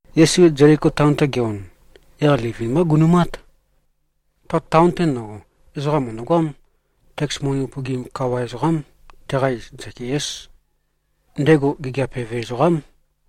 Yesu Zeliko taon-te ge-on, yaq livin-mbá gunu꞉mát. Ta taon-te ndøgo, ezoqam mø̀ndøgoám. Teks moni upøgim kawa ezoqám. Teqa iz Zakiés. Ndego gigiap eve ezoqám.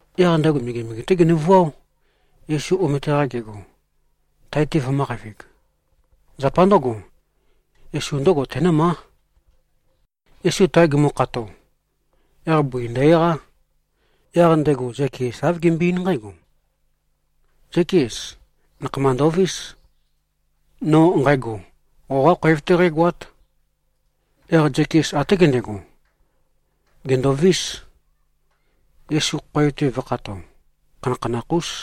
Yaq ndego megemege-té genøvuáo, Yesu omete-qa gego, tae-te vømø̄qavig. Zapa ndǿgo, Yesu ndǿgo tenǿmá. Yesu tae gumukhato, yaq bøi ndø-eqá. Yaq ndego Zakies āv gembøe-eín nqǽgo, “Zákies. Nakhama ndovís. No nqægo, qoqá khoev-té qǽgoát.” Yaq Zakies até gendego, gèndovís, Yesu khoev-te vø̄khato. Khanakhanakh-ús.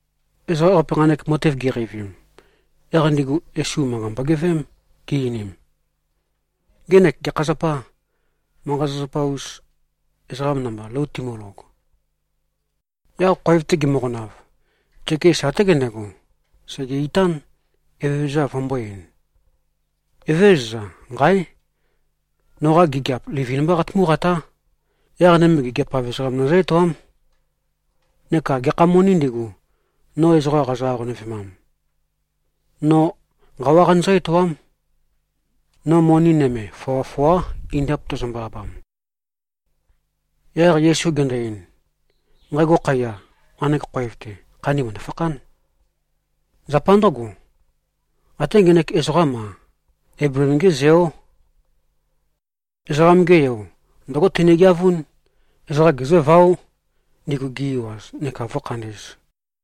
Ezoqa ewaqape, nqanek matev giqeivim, yaq ndigu Yesu, manqa mbogeveém, gi-einim, “Ngenek gekha zapâ, manqa-zapazapa-us ezoqa namba, lou timølog.” Yaq khoev-te gimøqonav, Zakies até gendego, sège-itán, Evezøza vømbō-ein, “Evézøza. Nqáe! Noqa gigiap livin-mbá qatumú-qatá. Yaq nøme, gigiap-av ezoqam nøzǿ-etoám. Neka gekha monī ndigu, no ezoqa qazø-aqonøvemam, no nqawá qanøzǿ-etoám. No moni nøme foa-foá, indap, tæzømbø-abam.” Yaq Yesu gendo-ein, “Nqægo khaiya, nqanek khoev-te, khandi mø̀ndø-fakhán. Zapa ndǿgo, até ngenek ezoqám-a, Eibleem-gé zeó. Ezoqam-ge Yo, ndǿgo tenegeavún. Ezoqa gezǿváo, ndigu gi-ewaz, neka vǿkhandī꞉z.”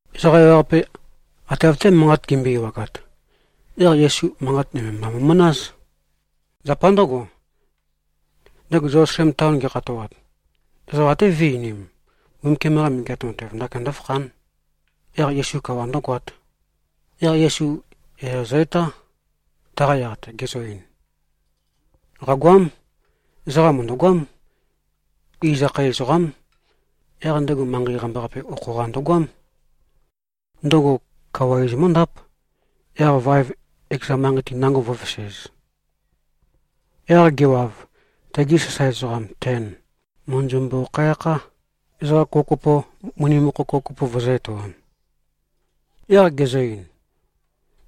Ezoqa ewaqape ate av-té manqat gimbøe-ewagat, yaq Yesu manqat nøme mba mo꞉manáz. Zapa ndǿgo, ndego Zelusalem taon ge꞉khatoat, ezoqa até vø̄e-einim, Mbumbukiam-qa Megeat Matev ndakin ndø̄fakhān, yaq Yesu kawa ndø̄goāt. Yaq Yesu yaya zø-etá, taqa yaq-te, gezø-ein, “Qàgoám. Ezoqam mø̀ndøgoám. Iz akhae ezoqám. Yaq ndego manqei qambaqape okho-qa ndøgoám. Ndøgo kawa iz mǿndáp, yaq vaev ekeza manqei-te nango vǿvesēz. Yaq gewav, tegi sasae ezoqam ten mø̀ndøzømbøkhæ-akhá, ezoqa kopokopo moni mokho kopokopo vøzø̄-etoam. Yaq gezø-ein,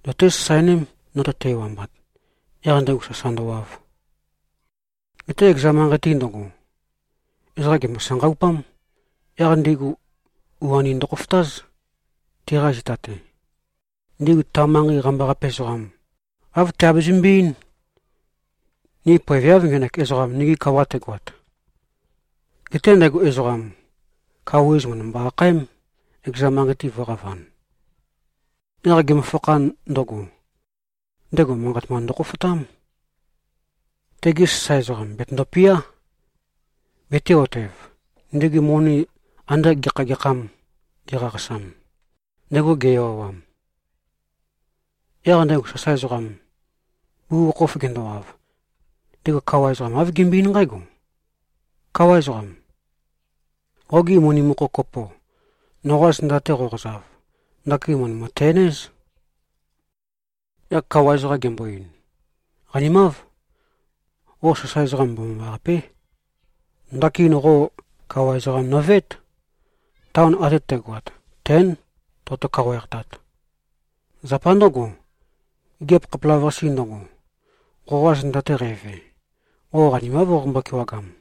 ‘Zøté-sasaeném, no tøte-ewambat,’ yaq ndego sasa ndøwav. Geté ekeza manqei-te ndøgo, ezoqa gèmbo-sanqaupám. Yaq ndigu u-anim ndøkhofotáz, teqa zita-te. Ndigu ta manqei qambaqape ezoqam, āv tiabezømbe-eín, ‘Ni poeveáv, ngenek ezoqam, nigi kawa tegoat.’ Geté ndego ezoqam, kawa iz mø̀ndømbo-akhaém, ekeza manqei-te vø̄qavan. Yaq gemøfakhan ndøgo, ndego manqat mba ndøkhofotám. Tegi sasae ezoqam bètøndopiá, betē-otev, ndigu moni ande gekha-gekhâm giqaqasam, ndego ge-ewawam. Yaq ndego sasae ezoqam, bugukhokhof gendowav, ndego kawa ezoqam āv gembøe-eín nqǽgo, ‘Káwa ezoqam. Qogi moni mokho kopo, noqa zenda-te qoqozav, ndakin mø̀ndømø-ten-éz.’ Yaq kawa ezoqam gembo-ein, ‘Qanimáv. Qo sasae ezoqam mbomambaqapé. Ndakin qo kawa ezoqam nøveét. Taon ate tægoat tén, toqoto-kawaeqtat. Zapa ndǿgo, gigiap khapelavøqase ndøgo, qoqa zenda-te qæve, qo qanimáv qoqombo-kewagam.’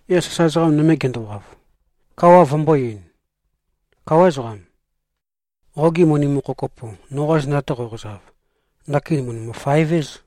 Yaq sasae ezoqa nøme gendowav, kawa vømbō-ein, ‘Káwa ezoqam. Qogi moni mokho kopo, noqa zenda-te qoqozav, ndakin mø̀ndømø-faev-éz.’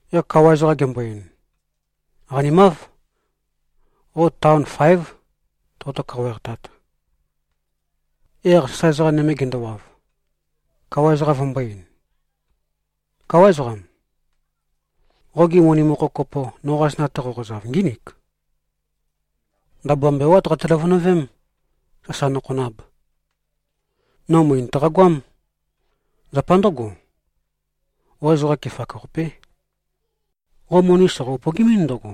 Yaq kawa ezoqam gembo-ein, ‘Qanimáv. Qo taon fáev, toqoto-kawaeqtat.’ Yaq sasae ezoqa nøme gendowav, kawa ezoqam vømbō-ein, ‘Káwa ezoqam. Qogi moni mokho kopo, noqa zenda-te qoqozav, ngínik. Ndabua mbewát qate-løvønøvém, sasa nokhonab. No møe nøtaqa-goám. Zapa ndǿgo, qo ezoqa kefak-qapé. Qo moni soqo-upøgimín ndøgo,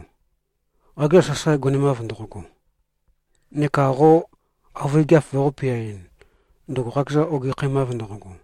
qakezan sasae gonemav ndoqogo, neka qo avøe gigiap voqō-peaɨn, ndøgo qakezan ogekhæmav ndoqogo.’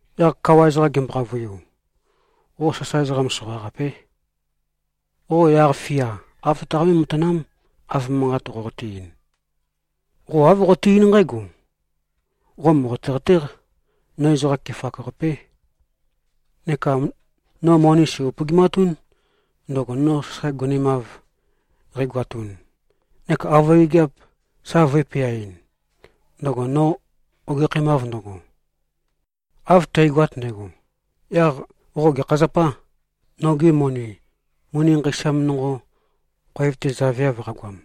Yaq kawa ezoqam gembo-qavøiu, ‘Qo sasae ezoqa soqaqapé. Qo yaq-fia āv tøtaqambé-matanám, av manqat qoqote-ein. Qo āv qoqote-eín nqǽgo: Qo mòqote-qatéq. No ezoqa kefak-qapé, neka no moni sæ̀-upøgimatún, ndøgo no sasae gonemav qægoatun neka avøe gigiap sa vø̄e-peaɨn, ndøgo no ogekhæmav ndøgo. Av tægoat ndægo, yaq qo gekha zapâ, nogi moni, moni nqeisam nonqo khoev-te zaveav qagoam?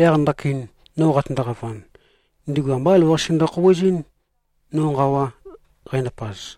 Yaq ndakin no qatøndo-qavan, ndigu ambá elavøqase ndøkhouwezɨ́n, no nqawa qændapaz.’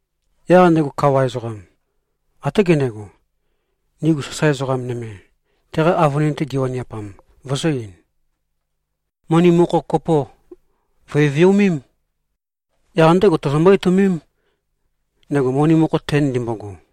Yaq ndego kawa ezoqam, até gendego, ndigu sasae ezoqa nøme, teqa avønin-te giwaniapam, vøzø̄-ein, ‘Moni mokho kopo vø̀e-viomém. Yaq ndégo tozombó-etøomém, ndego moni mokho ten ndimbogo.’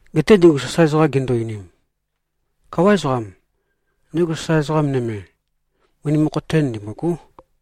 Geté ndigu sasae ezoqam gindu-einim, ‘Káwa ezoqam. Ndego sasae ezoqa nøme, moni mokho ten ndimbôgó.’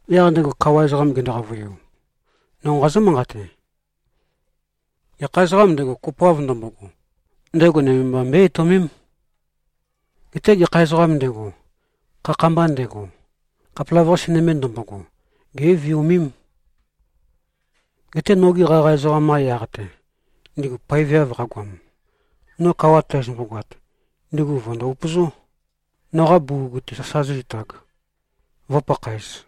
Yaq ndego kawa ezoqam gendo-qavøiu, ‘No nqazǿ-manqate: Gekha ezoqām ndego, kopoav ndømbogo, ndego nøme mba mbøé-etøomém. Geté gekha ezoqām ndego, khakha-mba ndego, khapelavøqase nøme ndømbogo, gé꞉viomém. Geté nogi qaqa ezoqam-qa yaq-te, ndigu poeveav qagoam, no kawa tæzømbo-goat, ndigu vø̀ndo-upøzó, noqa bugug-te sasa zǿzitāg, vǿpakhāez.’”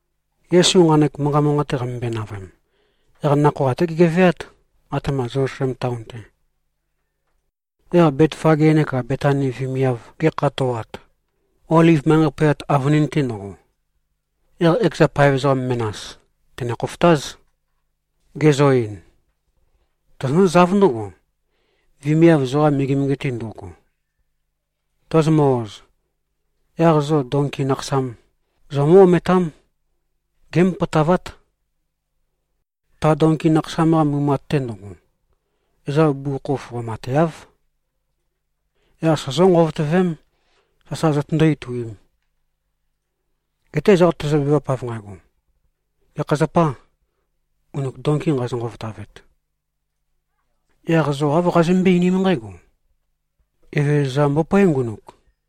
Yesu nqanek manqa manqate qamømbøe-navøem, yaq nakhoa até gegeveát, atema Zelusalem taon-te. Yaq Betfage neka Betani vemiav ge꞉khatoat, Oliv manqei poyat avønin-te ndøgo, yaq ekeza paev ezoqa menas tène-khofotáz, gezø-ein, “Tozonǿzáv ndǿgo, vemiav zoqa megemege-te ndo꞉go. Tozomø-oz, yaq zo donki nakhasam zomǿ-ometám. Gémopotavát. Ta donki nakhasam-qa mumat-te ndøgo, ezoqam bugukhokhof qomateáv. Yaq sozó-nqovotøvém, sasa zotøndó-ituīm. Geté ezoqa tezøbevap av nqægo, ‘Gekha zapâ, ngunuk donki nqazo-nqovotavet?’ Yaq zo āv qazømbøé-einím nqǽgo, ‘Evezøza mbopóe, ngunuk.’”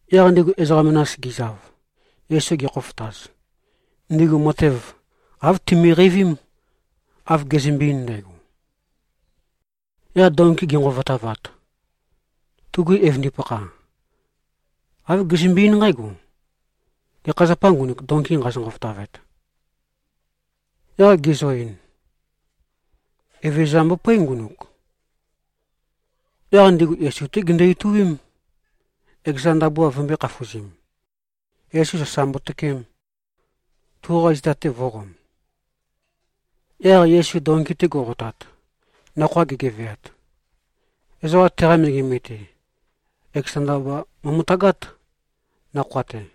Yaq ndigu ezoqa menas gizav, Yesu gekhofotaz, ndigu matev āv timiqeivím, av gezømbe-ein ndægo. Yaq donki gi꞉nqovotavat, tugi evøndipakha, āv gizømbe-eín nqǽgo, “Gekha zapâ, ngunuk donki nqazo-nqovotavet?” Yaq gizø-ein, “Evezøza mbopóe, ngunuk.” Yaq ndigu Yesu-té gindu-ituím, ekeza ndabua vømbø̄e-khafuzim, Yesu sasa mbotøkeem, tuqa zita-te vō꞉qom. Yaq Yesu donki-te go꞉qotat, nakhoa gegeveat, ezoqa teqa megemege-te, ekeza ndabua mo꞉møtagát, nakhoa-te.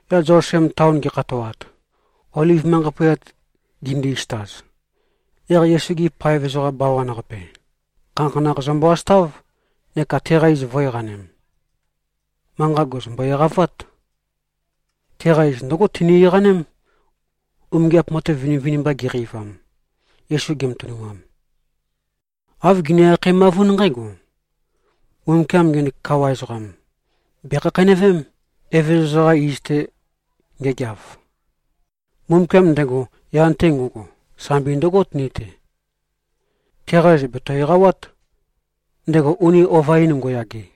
Yaq Zelusalem taon gi꞉khatoat, Oliv manqei poyat gindi-isøtaz, yaq Yesu-gi paev ezoqa bawan-qape, khanakhanakh zømbø-asøtáv, neka teqa iz vø̄-eqanem. Manqa gèzømbo-eqavát. Teqa iz ndǿgo tini-eqaném, umingiap matev vinivinimba giqeivam, Yesu gematønumam. Āv gini-akhaemavún nqǽgo, “Mbumbukiam ngenek kawa ezoqam, bèkhakheinøvém, Evezøza-qa iz-te ngegeav. Mbumbukiam ndego yan-te ngo꞉go, sambi ndøgót ni-te. Teqa iz bèto-eqawát, ndego uni ova-in ngo꞉yage.”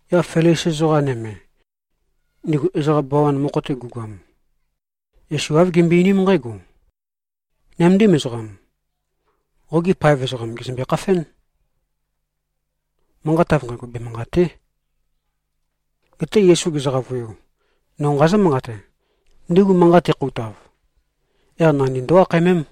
Yaq Felisi ezoqa nøme, ndigu ezoqa bawan-qape mokho-te gu꞉goam, Yesu āv gimbøe-einím nqǽgo, “Nøméndim ezoqam, qogi paev ezoqam gèzømbe-khafén. Manqat av nqægo bemanqàte᷄!” Geté Yesu gezø-qavøiu, “No nqazǿ-manqate: Ndigu manqat tikhoutav, yaq nandi ndó-akhaemém.”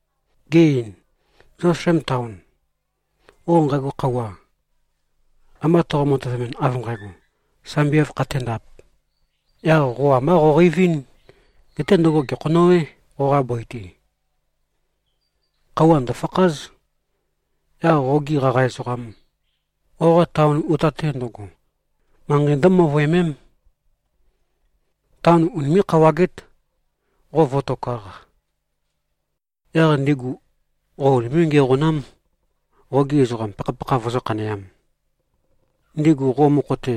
Ge-ein, “Zelusalem taon, qo nqægo khøuwa, amba toqo-matøvemɨn, av nqægo, ‘Sambi āv khaténdāp,’ yaq qo ambá qoqeivín. Geté ndøgo gèkhonøwé, qoqa bøi-te. Khøuwa ndø̀fakház. Yaq qogi qaqa ezoqam, qoqa taon uta-te ndøgo, manqei ndǿmøvøemém. Taon unimé꞉-khawagét, qo vǿtokāq. Yaq ndigu qo unimé꞉-ngiæqonám, qogi ezoqam pakhapakha vøzǿ-khaneām. Ndigu qo mokho-te,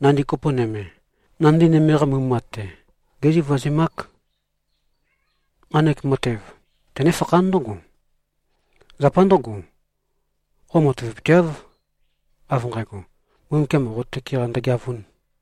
nandi kopo nøme, nandi nøme-qa mumat-te, gézivazemák. Nqanek matev tenéfakhán ndǿgo. Zapa ndǿgo, qo matavapøteáv, av nqægo, Mbumbukiam qo tøke-qa ndøgeavūn.”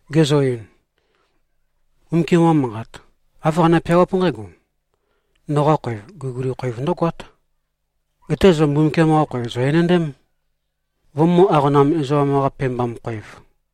Gezø-ein, “Mbumbukiam-qa Manqat, āv qane-peawáp nqǽgo, ‘Noqa khoev, guliguli khoev ndǿgoát.’ Geté zo Mbumbukiam-qa khoev, zò-enendém, vømø̄-aqonam-ezoqam-qa-pebam-khoev.”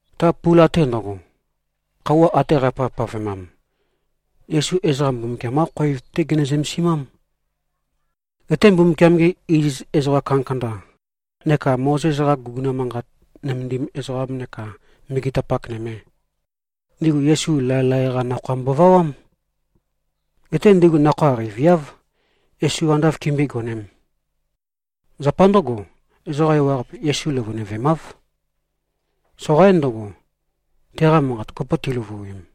Ta pula-te ndøgo, khøuwa ate qæpavpavemam, Yesu ezoqa Mbumbukiam-qá khoev-té gene-zømesimám. Geté Mbumbukiam-gi iziz ezoqa kandakanda neka Mozes-qa guguna manqat nømendim ezoqam neka megetapak nøme, ndigu Yesu laelae-qá nakhoa mbovawám. Geté ndigu nakhoa qeiviáv, Yesu ande āv kimbøé-gonēm. Zapa ndǿgo, ezoqa ewaqape Yesu løvøinøvemáv. Soqaín ndøgo, teqa manqat kopo ti꞉løvuim.